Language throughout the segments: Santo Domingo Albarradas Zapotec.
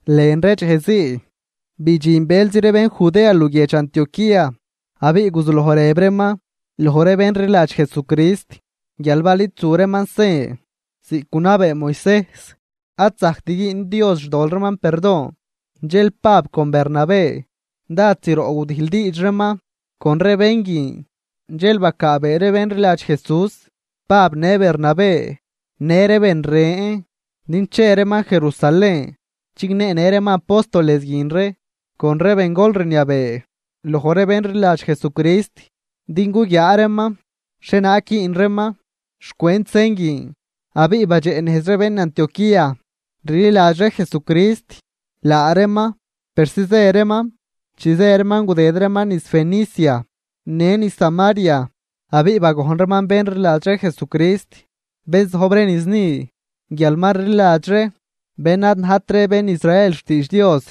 Lën ree dxej zii bidxin bëlzi ree bén Judea luguiedx Antioquía. Abiꞌ guzuloj rëb reeman loj ree bén rliladx Jesucrist, guial bal id zu reeman sen ziꞌc gunabee Moisejs, ad zajct güün Dios xtol reeman perdon. Dxel Pab con Bernabé dád zroꞌ gudijldiidx reeman con ree bén guin. Dxel bacaabee ree bén rliladx Jesús Pab në Bernabé, në ree ben ren din che reeman Jerusalén chigneenë reeman apóstoles guin ree, con ree bengol rniabee loj ree bén rliladx Jesucrist din guguiaa reeman xhienaag güün reeman xcwent sen guin. Abiꞌ badxeꞌnejz ree bén Antioquía rliladx ree Jesucrist laa reeman persi zë reeman. Chi zë reeman gudëd reeman niz Fenicia në niz Samaria abiꞌ bagojn reeman bén rliladx ree Jesucrist, bén zojb ree niz ni guial ma rliladx ree bén ad najt ree bén Israel xtiidx Dios.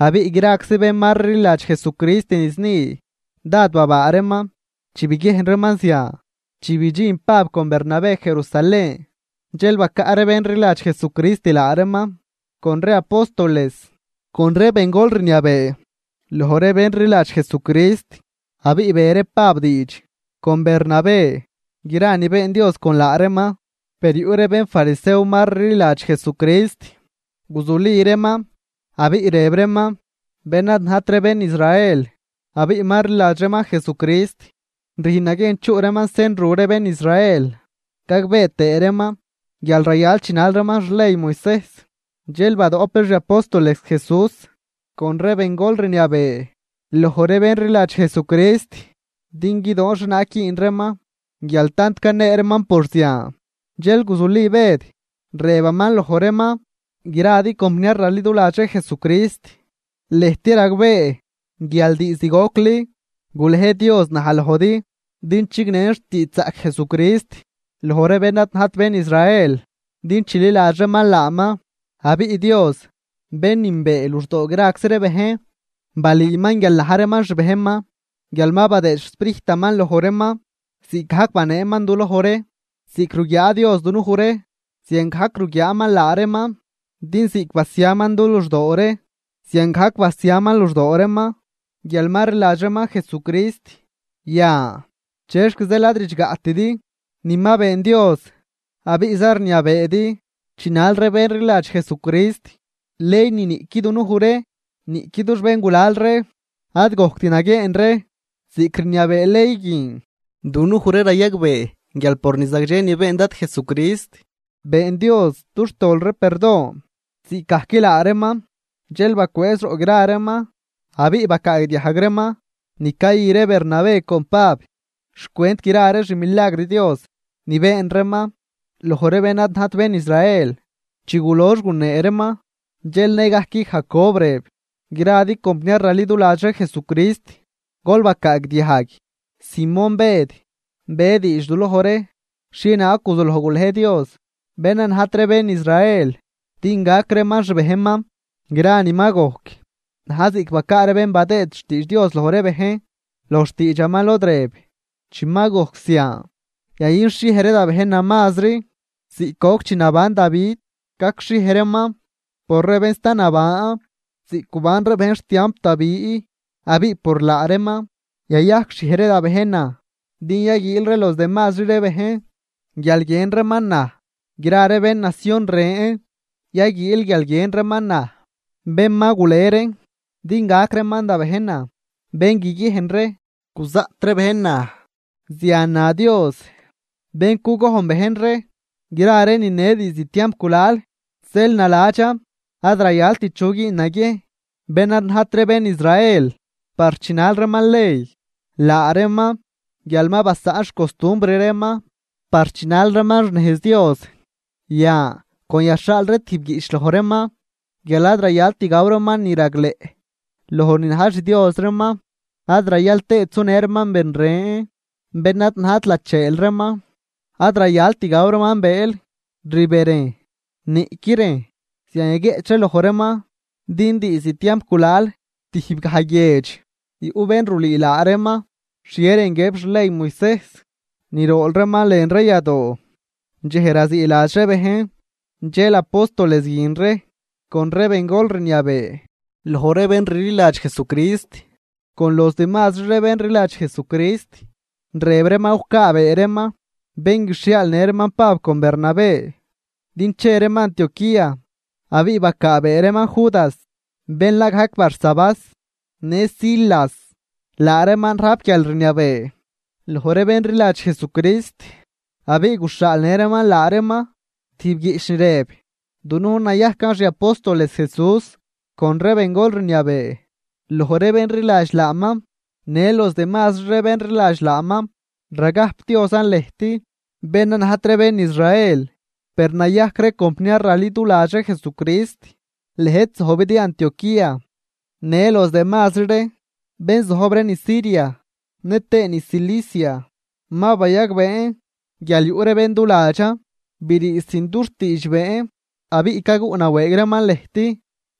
Abiꞌ graczi bén ma rliladx Jesucrist niz ni, dád babaa reeman chi biguiejn reeman zian. Chi bidxin Pab con Bernabé Jerusalén, dxel bacaꞌ ree bén rliladx Jesucrist laa reeman, con ree apóstoles, con ree bengol rniabee loj ree bén rliladx Jesucrist. Abiꞌ be ree Pab diidx con Bernabé gra ni been Dios con laa reeman. Per yuꞌ ree bénfarisew ma rliladx Jesucrist, guzuli reeman abiꞌ rëb reeman: ―Bén ad najt ree bén Israel abiꞌ ma rliladx reeman Jesucrist, rüjn naguiejn chuꞌ reeman sen ru ree bén Israel, gagbee tëë reeman guial rayal chinal reeman xley Moisejs. Dxel badoꞌp ree xi apóstoles Jesús con ree bengol rniabee loj ree bén rliladx Jesucrist din guidoon xhienaag güün reeman. Guial tant canee reeman por zian, dxel guzuli Bëd, rëbaman loj reeman: ―Gradi compniar raliduladx ree Jesucrist, lëjt ragbee guial diizd gocli gulej Dios naj lojdi din chignen xtiidxzaꞌc Jesucrist loj ree bén ad najt bén Israel din chililadx reeman laaman. Abiꞌ Dios bén nünbee luxdoo graczi ree bejn, balüüman guial na̱j reeman xbejnman guial ma badëëd xSprijtaman loj reeman ziꞌcgajc baneeman du loj ree. Ziꞌc ruguiaa Dios dunuj ree ziangajc ruguiaaman laa reeman, din ziꞌc basiaman du luxdoo ree ziangajc basiaman luxdoo reeman guial ma rliladx reeman Jesucrist. Yan, ¿chexc zeel ad ridxgaꞌtidi ni ma been Dios abiꞌza rniabeedi chinal ree bén rliladx Jesucrist ley ni niꞌqui dunuj ree niꞌqui dux béngulal ree ad gojct naguieen ree ziꞌc rniabee ley guin? Dunuj ree rayagbee guial por ni zagdxe ni been Dad Jesucrist, been Dios dux tol ree perdon ziꞌcgajc laa reeman. Dxel bacwëëz roꞌ gra reeman abiꞌ bacaagdiajg reeman ni cayü ree Bernabé con Pab, xcwent gra ree xmilagr Dios ni been reeman loj ree bén ad najt bén Israel. Chi gulox gunee reeman, dxel nëgajc Jacob rëb: ―Gradi compniar raliduladx ree Jesucrist, gol bacaagdiajg: Simón Bëd be diidx duloj ree xhienaag guzuloj gulej Dios bén ad najt ree bén Israel din gac reeman xbejnman. Gra ni ma gojc na̱j ziꞌc ni bacaa ree bén badëë xtiidx Dios loj ree bejn loj xtiidxaman lod rëb: Chi ma gojc zian, yayünxhiej ree da bejnan mazri ziꞌc goc chi naban Davi, gacxhiej reeman por ree bén sta naban, ziꞌc guban ree bejn xtiamp Davi abiꞌ por laa reeman yayajcxhiej ree da bejnan. Din yaguiil ree los demazri ree bejn guial guiën reeman naj, gra ree bén nacion ren, yaguiil guial guiën reeman naj, bén ma gule reen din gac reeman da bejnan, bén guiguiejn ree guzaꞌt ree bejn naj. Zian na Dios, bén cugojn bejn ree gra ree nine diizd tiamp gulal. ’Zeel naladxan ad rayalt chu güün naguiejn bén ad najt ree bén Israel par chinal reeman ley, laa reeman guial ma basaꞌn xcostumbr reeman par chinal reeman xnejz Dios. Yan con yaxhaal ree tijb guiꞌch loj reeman guial ad rayalt gaw reeman ni ragleꞌ loj ni na̱j xdios reeman, ad rayal tëët sunë reeman ben ren bén ad najt lacheel reeman, ad rayalt gaw reeman bëël rberejn niꞌqui rejn. Zian yaguieꞌch ree loj reeman, din diizd tiamp gulal tijb gaj guiedx yuꞌ bén rulüü laa reeman xhie rën guiëb xley Moisejs ni rool reeman lën ree yadoo dxej raziiladx ree bejn. Dxel apóstoles guin ree con ree bengol rniabee loj ree bén rliladx Jesucrist, con los demazri ree bén rliladx Jesucrist, rëb reeman gucaabee reeman bén guixhiaalnë reeman Pab con Bernabé din che reeman Antioquía. Abiꞌ bacaabee reeman Judas, bén la gajc Barsabás, në Silas, laa reeman rajp guialrniabee loj ree bén rliladx Jesucrist. Abiꞌ guxhaalnë reeman laa reeman tijb guiꞌch ni rëb: “Dunujn nayajcan xi apóstoles Jesús, con ree bengol rniabee loj ree bén rliladx laaman, në los demazri ree bén rliladx laaman. Ragajpdiozan lëjt bén ad najt ree bén Israel, per nayajc ree compniar raliduladx ree Jesucrist, lëjt zojbidi Antioquía, në los demazri ree bén zojb ree niz Siria nëtëë niz Cilicia. Ma bayagbeen guial yuꞌ ree bén duladxan brii sin dux tiidxbeen, abiꞌ caguꞌnawëëg reeman lëjt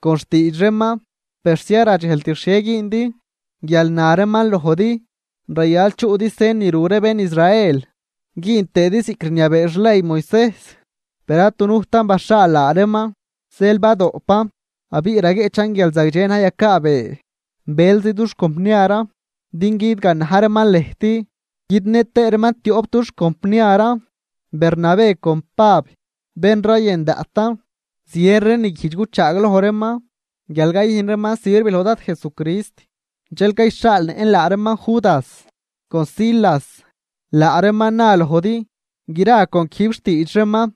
con xtiidx reeman persi ad radxejlt xhie güündi guial na reeman lojdi rayal chuꞌdi sen ni ru ree bén Israel güün tëëdi ziꞌc rniabee xley Moisejs, per ad dunujtan baxhaal laa reeman. Zeel badoꞌpan abiꞌ raguieꞌchan guial zagdxe na̱j yacaabee bëlzi dux compniaran din guidganaj reeman lëjt, guidnë tëë reeman tioꞌp dux compniaran, Bernabé con Pab, bén rayën daꞌtan. Zien ree ni guijdx cuchaagloj reeman guial cayüjn reeman sirv loj Dad Jesucrist. Dxel cayxhaalnëꞌn laa reeman Judas con Silas, laa reeman na lojdi gra con quijb xtiidx reeman.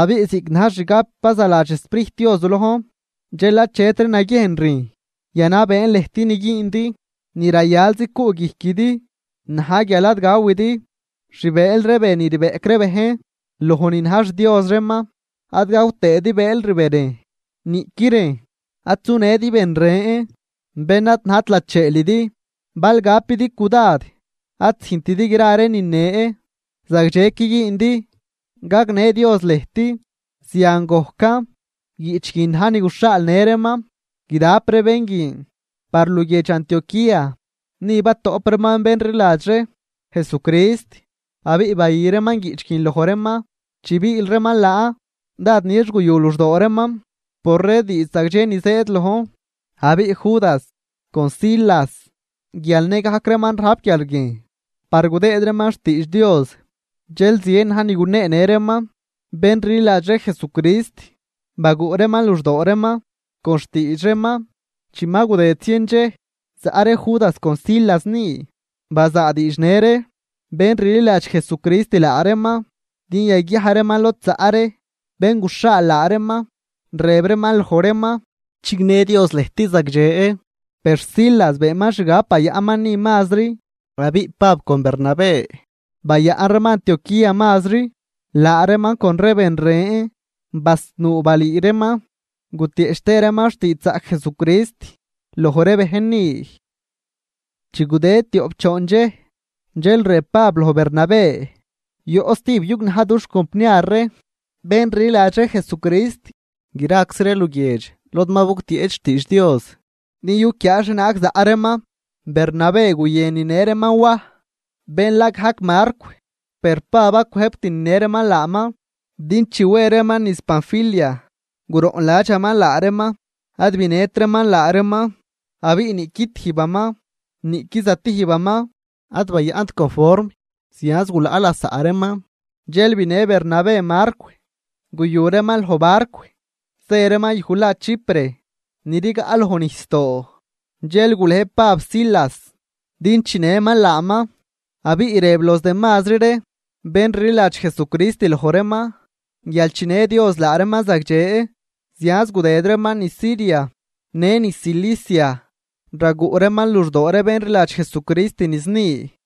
Abiꞌ ziꞌc na̱j xgab bazaladx xSprijt Dios du lojn, dxel achetri naguiejn rüjn yanabeen lëjt ni güündi, ni rayalzi cuꞌguijquidi na̱j guial, ad gawidi xbëël ree be ni rbeꞌc ree bejn loj ni na̱j xdios reeman, ad gaw tëëdi bëël rberejn, niꞌqui rejn, ad sunëdi ben ren bén ad najt lacheelidi. Bal gapidi cudad ad züjntidi gra ree nine, zagdxequi güündi. Gagnë Dios lëjt.” Zian gojcan, guiꞌch guin na̱j ni guxhaalnë reeman guidap ree bén guin par luguiedx Antioquía. Ni batoꞌp reeman bén rliladx ree Jesucrist abiꞌ bayü reeman guiꞌch guin loj reeman. Chi biil reeman laan, dád nix guyu luxdoo reeman por ree diidx zagdxe ni zëëd lojn. Abiꞌ Judas con Silas guial nëgajc reeman rajp quiarguiejn par gudëëd reeman xtiidx Dios, dxel zien na̱j ni guneenë reeman bén rliladx ree Jesucrist, baguꞌ reeman luxdoo reeman con xtiidx reeman. Chi ma gudëd zien dxej zaꞌ ree Judas con Silas ni, bazaadiidxnë ree bén rliladx Jesucrist laa reeman din yaguiaj reeman lod zaꞌ ree bén guxhaal laa reeman, rëb reeman loj reeman: “Chignë Dios lëjt zagdxe.” Per Silas beenman xgab bayaꞌnman ni mazri. Abiꞌ Pab con Bernabé bayaꞌn reeman Antioquía mazri, laa reeman con ree ben ren basnuu balüü reeman gutieꞌch tëë reeman xtiidxzaꞌc Jesucrist loj ree bejn ni. Chi gudëd tioꞌp choon dxej, dxel rëb Pab loj Bernabé: ―Yoꞌ stijb yugnaj dux compniar ree bén rliladx ree Jesucrist, graczi ree luguiedx lod ma bugtieꞌch xtiidx Dios, din yuquiaa xhienaag zaꞌ reeman. Bernabé guyën ninë reeman Waj, bén la gajc Marcw. Per Pab ad cwëjbt ninë reeman laaman, din chi we reeman niz Panfilia guroꞌnladxaman laa reeman, ad binëtraman laa reeman. Abiꞌ niꞌqui tijbaman niꞌqui zatijbaman ad bayaꞌnt conform, zianz gulaꞌ lasaꞌ reeman. Dxel binë Bernabé Marcw, guyu reeman loj barcw zë reeman yuj la Chipre ni rigaꞌ loj nijsdoo, dxel gulej Pab Silas din chinëman laaman abiꞌ rëb los demazri ree bén rliladx Jesucrist loj reeman guial chinë Dios laa reeman zagdxe. Zianz gudëd reeman niz Siria në niz Cilicia, raguꞌ reeman luxdoo ree bén rliladx Jesucrist niz ni.